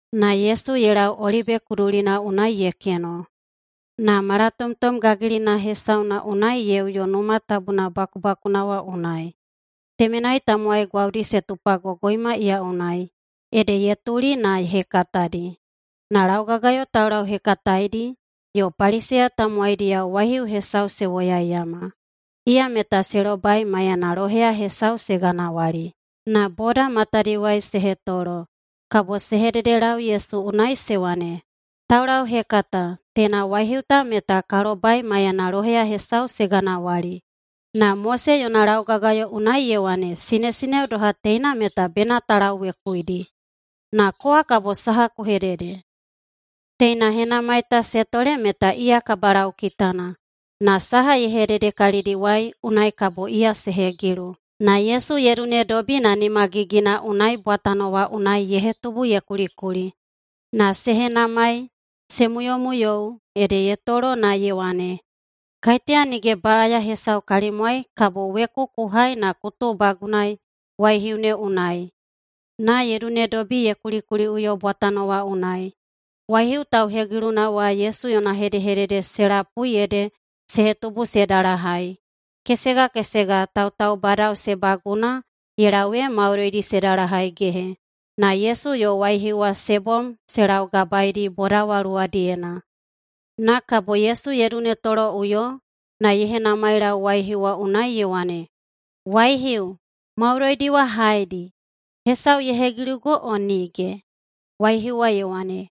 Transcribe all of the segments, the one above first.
Na Yesu ye lau Olibe kudulina unai ye keno, na malatomtom gagilina hesauna unai ye uyo Numa Tabuna bakubakuna wa unai. Temenai tamowai gwaudi se tupagogoima iya unai, ede ye tuli na ye hekatadi. Na laugagayo taulauhekataedi yo Paliseya tamowaidiyao waihiu hesau se woyaiyama. Iya meta se lobai maiyana loheya hesau se ganawali. Na boda matadiwai se hetolo. Kabo se hededelau Yesu unai se wane, “Taulauhekata, teina waihiu ta meta ka lobai maiyana loheya hesau se ganawali. Na Mose yona laugagayo unai ye wane sinesineo doha teina meta bena ta lauwekuidi. Na kowa kabo saha ku hedede?” Teina henamai ta se tole meta iya kabalaukitana, na saha ye hedede kalidiwai unai kabo iya se hegilu. Na Yesu ye dunedobi na nimagigina unai bwatano wa unai ye hetubu ye kulikuli. Na se henamai se muyomuyou, ede ye toloꞌuyo na ye wane, “Kaiteya nige baꞌaya hesau kalimwai kabo weku ku hai na ku tuubagunaei waihiu ne unai.” Na ye dunedobi ye kulikuliꞌuyo bwatano wa unai. Waihiu tauhegiluna wa Yesu yona hedehedede se lapui ede se hetubu se dalahai, kesega kesega tautaubadao se baguna ye lau ee maudoidi se dalahaigehe, na Yesu yo waihiu wa se bom se laugabaedi boda wa luwadiyena. Na kabo Yesu ye dunetoloꞌuyo, na ye henamailau waihiu wa unai ye wane, “Waihiu, maudoidi wa haedi? Hesau ye hegilugo o nige?” Waihiu wa ye wane,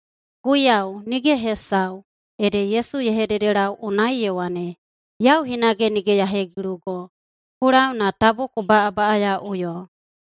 “Guiyau, nige hesau.” Ede Yesu ye hededelau unai ye wane, “Yau hinage nige ya hegilugo. Ku lau na tabu ku baꞌabaꞌayaꞌuyo.”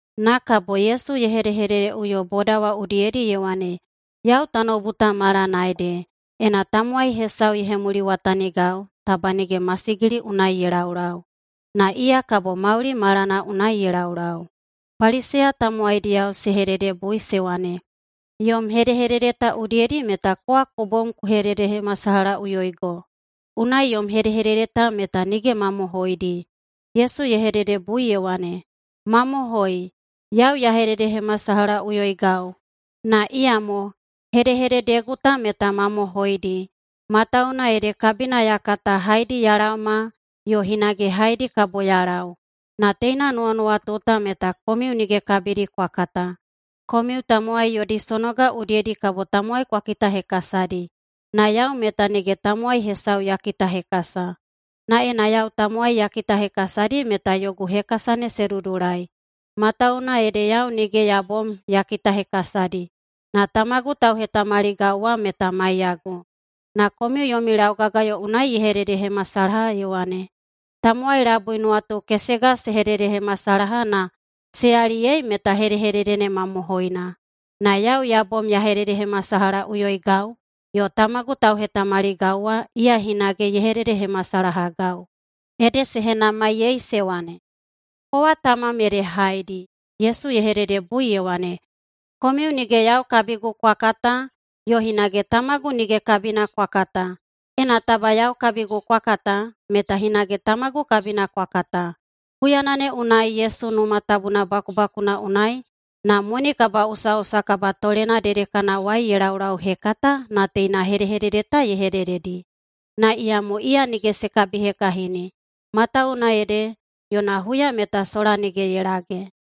Na kabo Yesu ye hedehededeꞌuyo boda wa udiyedi ye wane, “Yau tanoubu ta malana ede. Ena tamowai hesau ye hemuliwatanigau, taba nige masigili unai ye laulau, na iya kabo mauli malana unai ye laulau.” Paliseya tamowaidiyao se hededebui se wane, “Yom hedehedede ta udiyedi meta kowa ku bom ku hededehemasalahaꞌuyoigo, unai yom hedehedede ta meta nige mamohoidi.” Yesu ye hededebui ye wane, “Mamohoi, yau ya hededehemasalahaꞌuyoigau, na iyamo hedehededegu ta meta mamohoidi. Matawuwuna ede kabina ya kata haedi ya laoma yo hinage haedi kabo ya lau. Na teina nuwanuwatu ta meta komiu nige kabidi kwa kata. Komiu tamowai yodi sonoga udiyedi kabo tamowai kwa kitahekasadi, na yau meta nige tamowai hesau ya kitahekasa. Na ena yau tamowai ya kitahekasadi meta yogu hekasa ne se dudulai, matawuwuna ede yau nige ya bom ya kitahekasadi, na Tamagu tauhetamaligau wa meta maiyagu. Na komiu yomi laugagayo unai ye hededehemasalaha ye wane, ‘Tamowai labui nuwatu kesega se hededehemasalaha na se yaliyei meta hedehedede ne mamohoina.’ Na yau ya bom ya hededehemasalahaꞌuyoigau yo Tamagu tauhetamaligau wa iya hinage ye hededehemasalahagau.” Ede se henamaiyei se wane, “Kowa tamam ede haedi?” Yesu ye hededebui ye wane, “Komiu nige yau kabigu kwa kata yo hinage tamagu nige kabina kwa kata. Ena taba yau kabigu kwa kata meta hinage Tamagu kabina kwa kata.” Huyana ne unai Yesu Numa Tabuna bakubakuna unai na moni kabaꞌusaꞌusa kabatolena dedekanawai ye laulauhekata na teina hedehedede ta ye hedededi. Na iyamo iya nige se kabihekahini, matawuwuna ede yona huya meta sola nige ye lage.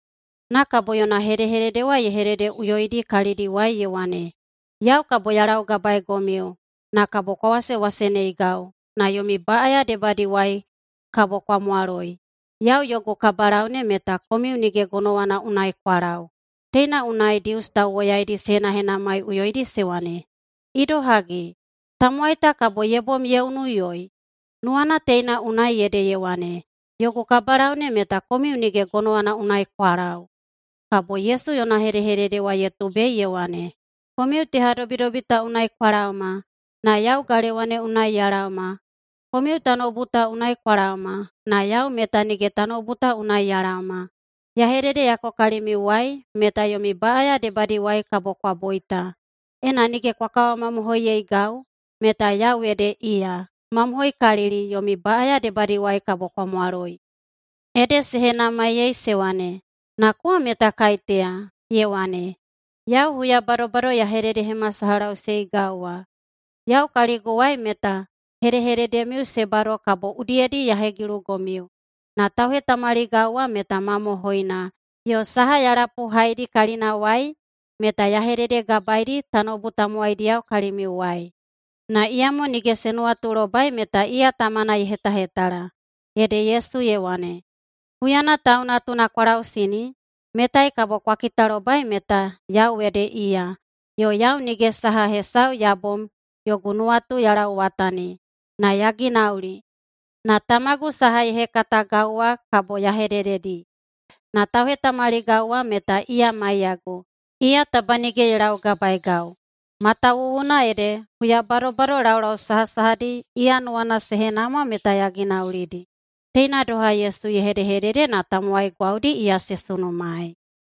Na kabo yona hedehedede wa ye hededeꞌuyoidi kalidiwai ye wane, “Yau kabo ya laugabaegomiu, na kabo kwa wasewaseneigau, na yomi baꞌaya debadiwai kabo kwa mwaloi. Yau yogu kabalau ne meta komiu nige gonowana unai kwa lau.” Teina unai Dius tauwoyaidi se henahenamaiꞌuyoidi se wane, “Idohagi, tamowai ta kabo ye bom ye unuiꞌuyoi? Nuwana teina unai ede ye wane, ‘Yogu kabalau ne meta komiu nige gonowana unai kwa lau’?” Kabo Yesu yona hedehedede wa ye tubei ye wane, “Komiu tehadobidobi ta unai kwa laoma na yau galewa ne unai ya laoma. Komiu tanoubu ta unai kwa laoma, na yau meta nige tanoubu ta unai ya laoma. Ya hededeyako kalimiuwai meta yomi baꞌaya debadiwai kabo kwa boita. Ena nige kwa kawamamohoiyeigau meta Yau ede Iya, mamohoikalili yomi baꞌaya debadiwai kabo kwa mwaloi.” Ede se henamaiyei se wane, “Na kowa meta kaiteya?” Ye wane, “Yau huya badobado ya hededehemasalahaꞌuseigau wa. Yau kaliguwai meta hedehededemiu se bado kabo udiyedi ya hegilugomiu. Na tauhetamaligau wa meta mamohoina, yo saha ya lapuhaidi kalinawai meta ya hededegabaedi tanoubu tamowaidiyao kalimiuwai.” Na iyamo nige se nuwatulobai meta iya Tamana ye hetahetala. Ede Yesu ye wane, “Huyana Tau Natuna kwa lausini, metai kabo kwa kitalobai meta Yau ede Iya, yo yau nige saha hesau ya bom yogu nuwatu ya lauwatani na ya ginauli, na Tamagu saha ye hekatagau wa kabo ya hedededi. Na tauhetamaligau wa meta iya maiyagu. Iya taba nige ye laugabaegau, matawuwuna ede huya badobado laulau sahasahadi iya nuwana se henamwa meta ya ginaulidi.” Teina doha Yesu ye hedehedede na tamowai gwaudi iya se sunumaei.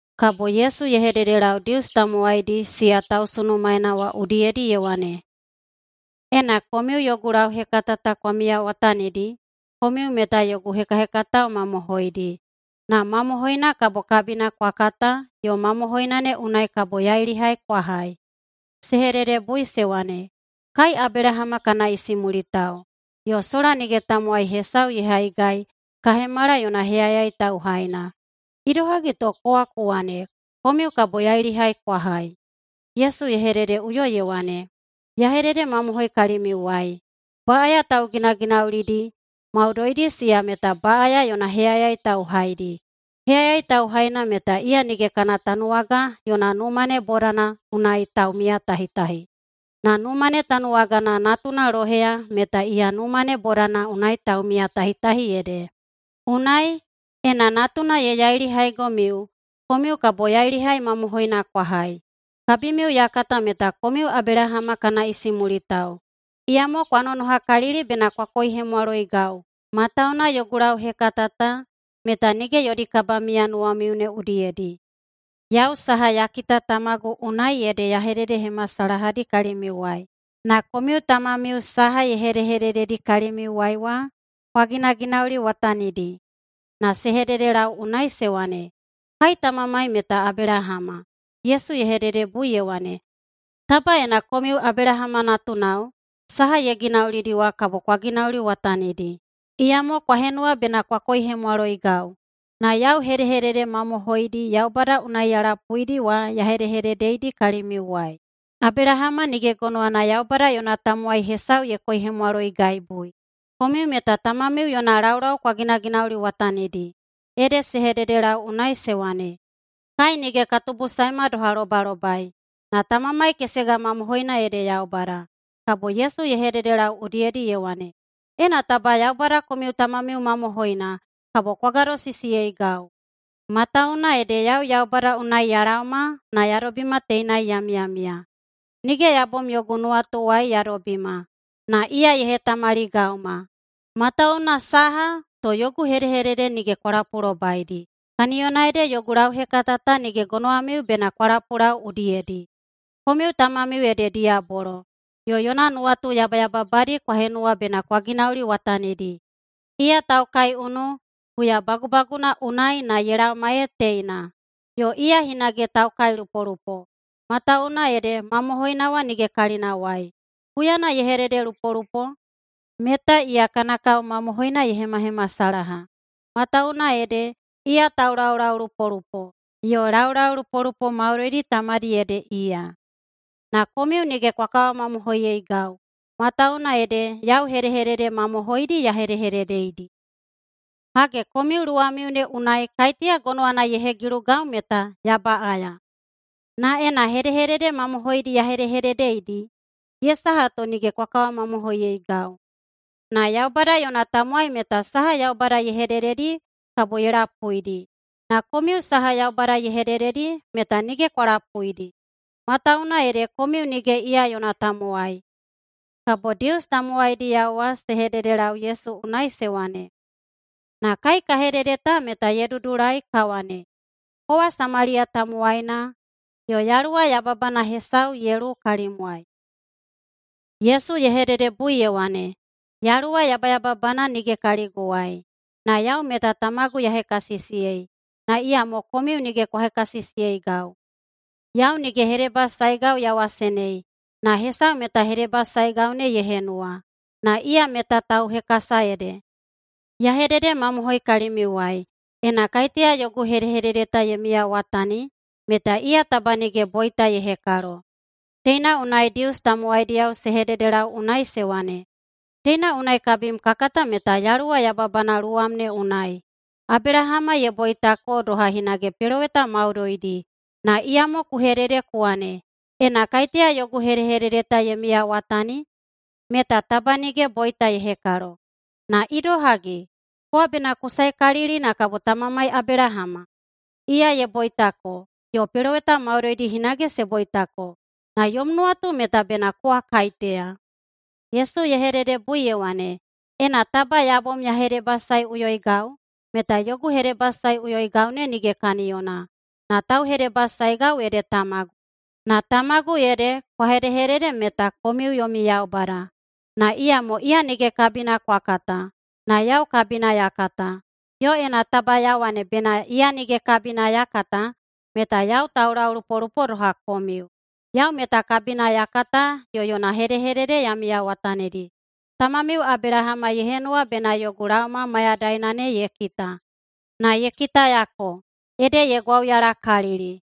Kabo Yesu ye hededelau Dius tamowaidi siya tausunumaena wa udiyedi ye wane, “Ena komiu yogu lauhekata ta kwa miyawatanidi, komiu meta yogu hekahekatao mamohoidi, na mamohoina kabo kabina kwa kata yo mamohoina ne unai kabo yailihai kwa hai.” Se hededebui se wane, “Kai Abelahama kana isimulitao, yo sola nige tamowai hesau ye haigai ka hemala yona heyayai tauhaina. Idohagi to kowa ku wane, ‘Komiu kabo yailihai kwa hai’?” Yesu ye hededeꞌuyo ye wane, “Ya hededemamohoi kalimiuwai: Baꞌaya tauginaginaulidi maudoidi siya meta baꞌaya yona heyayai tauhaidi. Heyayai tauhaina meta iya nige kana tanuwaga yona numa ne bodana unai taumiyatahitahi, na numa ne tanuwagana natuna loheya meta iya numa ne bodana unai taumiyatahitahi ede. Unai, ena Natuna ye yailihaigomiu, komiu kabo yailihai mamohoina kwa hai. Kabimiu ya kata meta komiu Abelahama kana isimulitao. Iyamo kwa nonohakalili bena kwa koihemwaloigau, matawuwuna yogu lauhekata ta meta nige yodi kabamiya nuwamiu ne udiyedi. Yau saha ya kita Tamagu unai ede ya hededehemasalahadi kalimiuwai, na komiu tamamiu saha ye hedehedededi kalimiuwai wa kwa ginaginauliwatanidi.” Na se hededelau unai se wane, “Kai tamamai meta Abelahama.” Yesu ye hededebui ye wane, “Taba ena komiu Abelahama natunao, saha ye ginaulidi wa kabo kwa ginauliwatanidi. Iyamo kwa henuwa bena kwa koihemwaloigau, na yau hedehedede mamohoidi Yaubada unai ya lapuidi wa ya hedehededeidi kalimiuwai. Abelahama nige gonowana Yaubada yona tamowai hesau ye koihemwaloigaibui. Komiu meta tamamiu yona laulau kwa ginaginauliwatanidi.” Ede se hededelau unai se wane, “Kai nige ka tubusaema doha lobalobai, na tamamai kesega mamohoina ede Yaubada.” Kabo Yesu ye hededelau udiyedi ye wane, “Ena taba Yaubada komiu tamamiu mamohoina, kabo kwa gadosisiyeigau. Matawuwuna ede yau Yaubada unai ya laoma na ya dobima teinai ya miyamiya. Nige ya bom yogu nuwatuwai ya dobima, na iya ye hetamaligauma. Matawuwuna saha to yogu hedehedede nige kwa lapulobaidi? Kaniyona ede yogu lauhekata ta nige gonowamiu bena kwa lapulau udiyedi. Komiu tamamiu ede diyabolo, yo yona nuwatu yabayababadi kwa henuwa bena kwa ginauliwatanidi. Iya taukaiunu huyabagubaguna unai na ye laoma ee teina, yo iya hinage taukailupolupo, matawuwuna ede mamohoina wa nige kalinawai. Huyana ye hededelupolupo, meta iya kana kao mamohoina ye hemahemasalaha, matawuwuna ede iya taulaulaulupolupo, yo laulaulupolupo maudoidi tamadi ede iya. Na komiu nige kwa kawamamohoiyeigau, matawuwuna ede yau hedehedede mamohoidi ya hedehededeidi. Hage, komiu luwamiu ne unai kaiteya gonowana ye hegilugau meta ya baꞌaya? Na ena hedehedede mamohoidi ya hedehededeidi, ye saha to nige kwa kawamamohoiyeigau? Na Yaubada yona tamowai meta saha Yaubada ye hedededi kabo ye lapuidi. Na komiu saha Yaubada ye hedededi meta nige kwa lapuidi, matawuwuna ede komiu nige iya yona tamowai.” Kabo Dius tamowaidiyao wa se hededelau Yesu unai se wane, “Na kai ka hedede ta meta ye dudulai ka wane, kowa Samaliya tamowaina yo yaluwa yababana hesau ye luwu kalimwai.” Yesu ye hededebui ye wane, “Yaluwa yabayababana nige kaliguwai, na yau meta Tamagu ya hekasisiyei, na iyamo komiu nige kwa hekasisiyeigau. Yau nige hedebasaegau ya wasenei, na hesau meta hedebasaegau ne ye henuwa, na iya meta tauhekasa ede. Ya hededemamohoi kalimiuwai: Ena kaiteya yogu hedehedede ye miyawatani, meta iya taba nige boita ye hekalo.” Teina unai Dius tamowaidiyao se hededelau unai se wane, “Teina unai kabim ka kata meta yaluwa yababana luwam ne unai. Abelahama ye boitako doha hinage peloweta maudoidi, na iyamo ku hedede ku wane, ‘Ena kaiteya yogu hedehedede ta ye miyawatani, meta taba nige boita ye hekalo.’ Na idohagi? Kowa bena ku saekalili na kabo tamamai Abelahama? Iya ye boitako, yo peloweta maudoidi hinage se boitako. Na yom nuwatu meta bena kowa kaiteya?” Yesu ye hededebui ye wane, “Ena taba ya bom ya hedebasaeꞌuyoigau, meta yogu hedebasaeꞌuyoigau ne nige kaniyona, na tauhedebasaegau ede Tamagu. Na Tamagu ede kwa hedehedede meta komiu yomi Yaubada. Na iyamo iya nige kabina kwa kata, na yau kabina ya kata. Yo ena taba ya wane bena iya nige kabina ya kata meta yau taulaulaulupolupo doha komiu. Yau meta kabina ya kata yo yona hedehedede ya miyawatanidi. Tamamiu Abelahama ye henuwa bena yogu laoma mayadaina ne ye kita, na ye kitayako, ede ye gwauyalakalili.”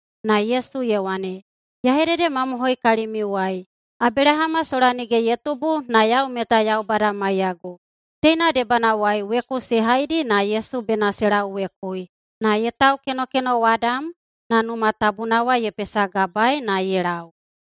Na Yesu ye wane, “Ya hededemamohoi kalimiuwai: Abelahama sola nige ye tubu na yau meta Yaubada maiyagu.” Teina debanawai weku se haidi na Yesu bena se lauwekui, na ye taukenokenowadam na Numa Tabuna wa ye pesagabaei na ye lau.